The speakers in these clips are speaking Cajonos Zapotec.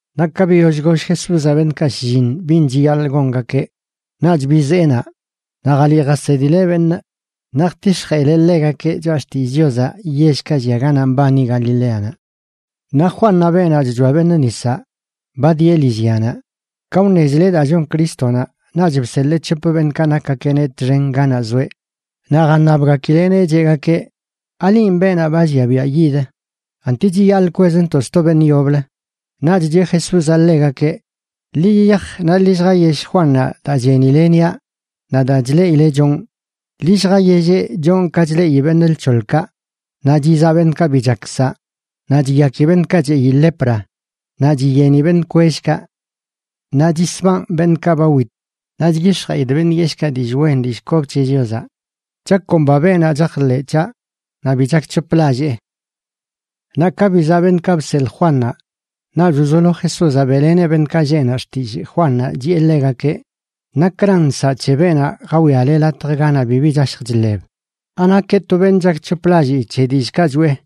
Naꞌ ka biyoll goll Jesúzaꞌ beṉꞌkaꞌ shlliṉ bin chiyaḻꞌ gongakeꞌ, naꞌch bizee naꞌ, naꞌ jaliꞌ jasedileꞌ beṉꞌ naꞌ jtix̱jeꞌileꞌ ḻegakeꞌ choꞌa xtillꞌ Chiozaꞌ yellkaꞌ llia ganaꞌ mbani Galileanaꞌ. Naꞌ Juannaꞌ beenaꞌ chchoa beṉꞌ nisaꞌ, ba dieꞌ lillyanaꞌ. Ka wṉezileꞌ daa chon Crístonaꞌ, naꞌch bseḻee c̱hop beṉꞌkaꞌ nakgakeꞌneꞌ txen ganaꞌ zoeꞌ. Naꞌ jaṉabgakileꞌneꞌ cheꞌgakeꞌ: ―¿Alinꞌ beenaꞌ ba llia biaꞌ yid?, ¿anti chiyaḻꞌ kwezntoꞌ sto beṉꞌ yoblə? Naꞌch cheꞌ Jesúzaꞌ ḻegakeꞌ: ―Ḻi yiyaj naꞌ ḻi lljayell Juannaꞌ daa chenile niaꞌ naꞌ daa chleꞌile chonꞌ. Ḻi lljayelleꞌ chonꞌ ka chleꞌi beṉꞌ lc̱hoḻkaꞌ, naꞌ chizaꞌ beṉꞌkaꞌ bi chak saꞌ, naꞌ chiyaki beṉꞌka cheꞌi lepra, naꞌ chiyeni beṉꞌ kwellkaꞌ, naꞌ chisbanꞌ beṉꞌkaꞌ ba wit, naꞌ chyix̱jeꞌidꞌ beṉꞌ yeshꞌkaꞌ dillꞌ wen dillꞌ kob c̱he Chiozaꞌ. Chakomba beenaꞌ chajḻeꞌ c̱haꞌ naꞌ bi chakc̱hoplallee. Naꞌ ka bizaꞌ beṉꞌkaꞌ bseḻꞌ Juannaꞌ, naꞌch wzolo Jesúzaꞌ beꞌleneꞌ beṉꞌkaꞌ lleꞌ naꞌ xtillꞌ Juannaꞌ, chiꞌe ḻegakeꞌ: ―¿Nakran nsaꞌ c̱he beenaꞌ jawiale latjaꞌ ganaꞌ bibi chashj chḻeb? ¿Anakeꞌ to beṉꞌ chakc̱hoplallii c̱he dillꞌkaꞌ choꞌe?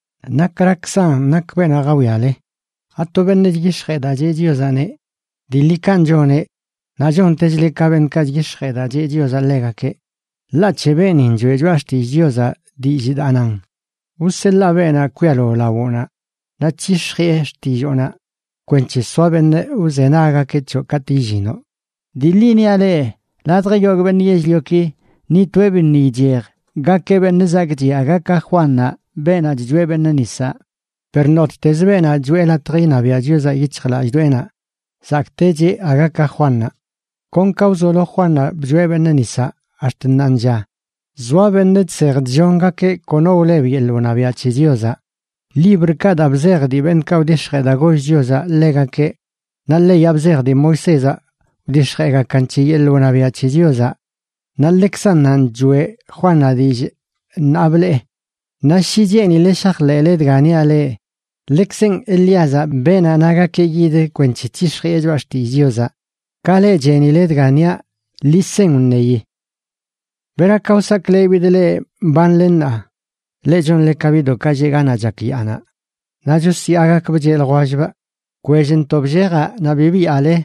¿Nakrakzan nak beenaꞌ jawiale? ¿Ato beṉꞌ chyix̱jee daa cheꞌ Chiozaꞌneꞌ? Dii ḻi kanꞌ choneꞌ, naꞌ chontechleꞌ ka beṉꞌkaꞌ chyix̱jee daa cheꞌ Chiozaꞌ ḻegakeꞌ. Ḻaꞌ c̱he beenin choꞌe Choꞌa Xtillꞌ Chiozaꞌ dillꞌ daa nan: Wseḻaa beenaꞌ kwialo lawoꞌnaꞌ, naꞌ c̱hix̱jiꞌe xtilloonaꞌ kwenc̱he soa beṉꞌ wzenaggakeꞌ c̱hoꞌ katꞌ illinoꞌ. Dii ḻi niaꞌ leꞌ, ladj yogꞌ beṉꞌ yell-lioki, ni toeꞌ biṉꞌ ichej gakeꞌ beṉꞌ zakꞌchiꞌ aga ka Juannaꞌ beenaꞌ chchoa beṉꞌ nisaꞌ. Per nottezə beenaꞌ choeꞌ latj iṉabiaꞌ Chiozaꞌ yic̱hjlallꞌdoꞌenaꞌ, zakꞌtecheꞌ aga ka Juannaꞌ. ’Kon ka wzolo Juannaꞌ bchoeꞌ beṉꞌ nisaꞌ ax̱t ṉaanlla, zoa beṉꞌ chsej chllongakeꞌ kono wleb yeḻꞌ wṉabiaꞌ c̱he Chiozaꞌ.a Librkaꞌ daa bzej dii beṉꞌkaꞌ wdix̱jee daa goll Chiozaꞌ ḻegakeꞌ naꞌ leyaꞌ bzej dii Moisézaꞌ wdix̱jeegakan c̱he yeḻꞌ wṉabiaꞌ c̱he Chiozaꞌ, naꞌ ḻekzannanꞌ choꞌe Juannaꞌ dillꞌ ṉaa blee. Naꞌ shi cheenile shajḻeꞌle dga niaꞌ leꞌ, ḻekzenꞌ Elíazaꞌ, beenaꞌ nagakeꞌ yid kwenc̱he c̱hix̱jiꞌe choꞌa xtillꞌ Chiozaꞌ. Ka leꞌ chenile dga niaꞌ, ḻi sen wṉeyi. ’¿Bera ka wsaklebidꞌ leꞌ mbanle ṉaa? Leꞌ chonle ka biꞌdoꞌkaꞌ lleꞌ ganaꞌ chak yaanaꞌ naꞌ chosyaagakbꞌ cheꞌ ljwellbꞌ: “Bkwellntoꞌ bllejaꞌ naꞌ bi byaale,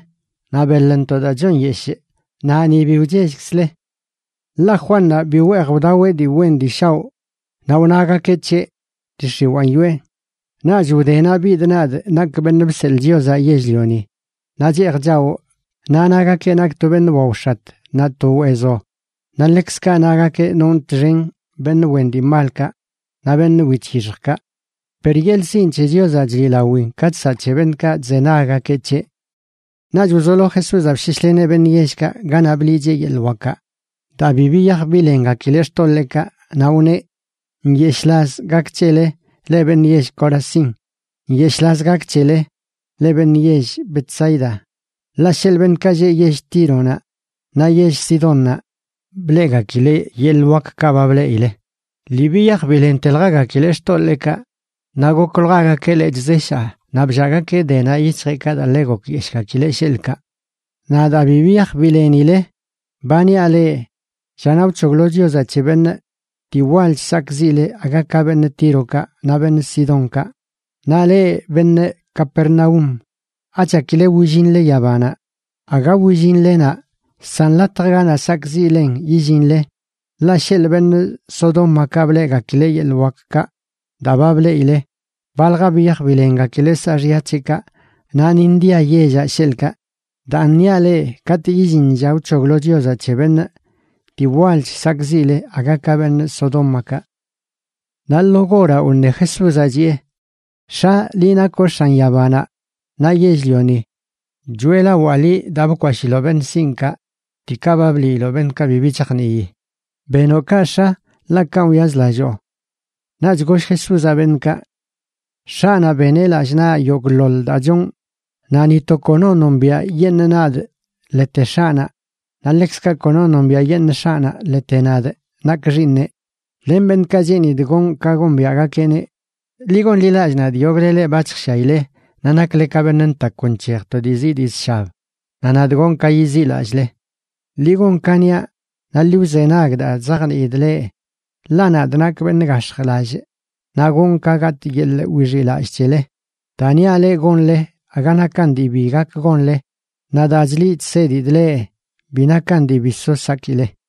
naꞌ beḻntoꞌ daa chon nyeshꞌ naꞌ ni bi wchellkzle.” Ḻaꞌ Juannaꞌ bi weej wdaweꞌ dii wen dii shaoꞌ, naꞌ wnagakeꞌ c̱heꞌ: “Dii x̱iwaan yoꞌe.” Naꞌch wdenaꞌ bidꞌ nadꞌ nakꞌ Beṉꞌ Bseḻꞌ Chiozaꞌ Yell-lioni, naꞌ cheej chawꞌ, naꞌ nagakeꞌ nakꞌ to beṉꞌ waox̱at naꞌ to weezo, naꞌ ḻekzkaꞌ nagakeꞌ nonꞌ txen beṉꞌ wen dii malkaꞌ naꞌ beṉꞌ wic̱hixjkaꞌ. Per yeḻꞌ sinꞌ c̱he Chiozaꞌ chliꞌlawin ka chsaꞌ c̱he beṉꞌkaꞌ chzenaggakeꞌ c̱heꞌ. Naꞌch wzolo Jesúzaꞌ bsheshleneꞌ beṉꞌ yellkaꞌ ganaꞌ bliꞌcheꞌ yeḻꞌ wakaꞌ, daa bi biyaj bilengakileꞌ xtoḻeekaꞌ. Naꞌ wneꞌ: ―¡Nyeshꞌlaz gak c̱hele, leꞌ beṉꞌ yell Corazín! ¡Nyeshꞌlaz gak c̱hele, leꞌ beṉꞌ yell Betsaida! Ḻaꞌ sheḻꞌ beṉꞌkaꞌ lleꞌ yell Tíronaꞌ naꞌ yell Sidónnaꞌ bleꞌgakileꞌ yeḻꞌ wakkaꞌ ba bleꞌile, lii biyaj bilenteljagakileꞌ xtoḻeekaꞌ, naꞌ gokwljagakeꞌ lechꞌ zeshaa naꞌ bllaagakeꞌ denaꞌ yic̱hjeꞌkaꞌ daa ḻe gokyeshꞌgakileꞌ, sheḻꞌkaꞌ. Naꞌ daa bi biyaj bilenile, ba niaꞌ leꞌ, llanaꞌ wc̱hoglo Chiozaꞌ c̱he benꞌ, dii walch sakꞌziꞌle aga ka beṉꞌ Tírokaꞌ naꞌ beṉꞌ Sidónkaꞌ. Naꞌ leꞌ beṉꞌ Capernaúm, ¿achakile willinle yabanaꞌ? Aga willinle naꞌ, san latj ganaꞌ sakꞌziꞌlen yillinle. Ḻaꞌ sheḻꞌ beṉꞌ Sodómakaꞌ bleꞌgakileꞌ yeḻꞌ wakkaꞌ daa ba bleꞌile, balja biyaj bilengakileꞌ saaxya c̱heꞌkaꞌ naꞌ ni ndia yellaꞌ, sheḻꞌkaꞌ. Daan niaꞌ leꞌ, katꞌ illin lla wc̱hoglo Chiozaꞌ c̱he beṉꞌ, dii walch sakꞌziꞌle aga ka beṉꞌ Sodómakaꞌ. Naꞌ lo goraꞌ wṉe Jesúzaꞌ, chiꞌe: ―X̱a, liꞌ nakoꞌ x̱an yabanaꞌ naꞌ yell-lioni, choeꞌlawaa liꞌ daa bkwashiloꞌ beṉꞌ sinꞌkaꞌ diikaꞌ ba bliiloꞌ beṉꞌkaꞌ bibi chajnii. Benoꞌ kaꞌ, X̱a, ḻaꞌ kanꞌ wyazlalloo. Naꞌch goll Jesúzaꞌ beṉꞌkaꞌ: ―X̱aꞌnaꞌ beneꞌ lallꞌ naꞌ yogꞌḻoḻ daa chonꞌ. Naꞌ ni to kono nombiaꞌyeṉꞌ nadꞌ ḻete X̱aꞌnaꞌ, naꞌ ḻekzkaꞌ kono nombiaꞌyeṉꞌ X̱aꞌnaꞌ ḻete nadꞌ nakꞌ Xiiṉeꞌ len beṉꞌkaꞌ cheenidꞌ gonꞌ ka gombiaꞌgakeꞌneꞌ. Ḻi gonḻilallꞌ nadꞌ, yogꞌle leꞌ ba chjshiaile naꞌ nakle ka beṉꞌ ntakw nc̱hej to dii zii dii zshab, naꞌ nadꞌ gonꞌ ka yiziꞌlallꞌle. Ḻi gon ka niaꞌ, naꞌ ḻi wzenag daa chzajniidꞌ leꞌ, ḻaꞌ nadꞌ nakꞌ beṉꞌ gax̱jlallꞌ naꞌ gonꞌ ka gatꞌ yeḻꞌ wixiꞌlallꞌ c̱hele. Daa niaꞌ leꞌ gonle aga nakan dii bi gak gonle, naꞌ daa chliꞌ chsedidꞌ leꞌ bi nakan dii bi so sakile.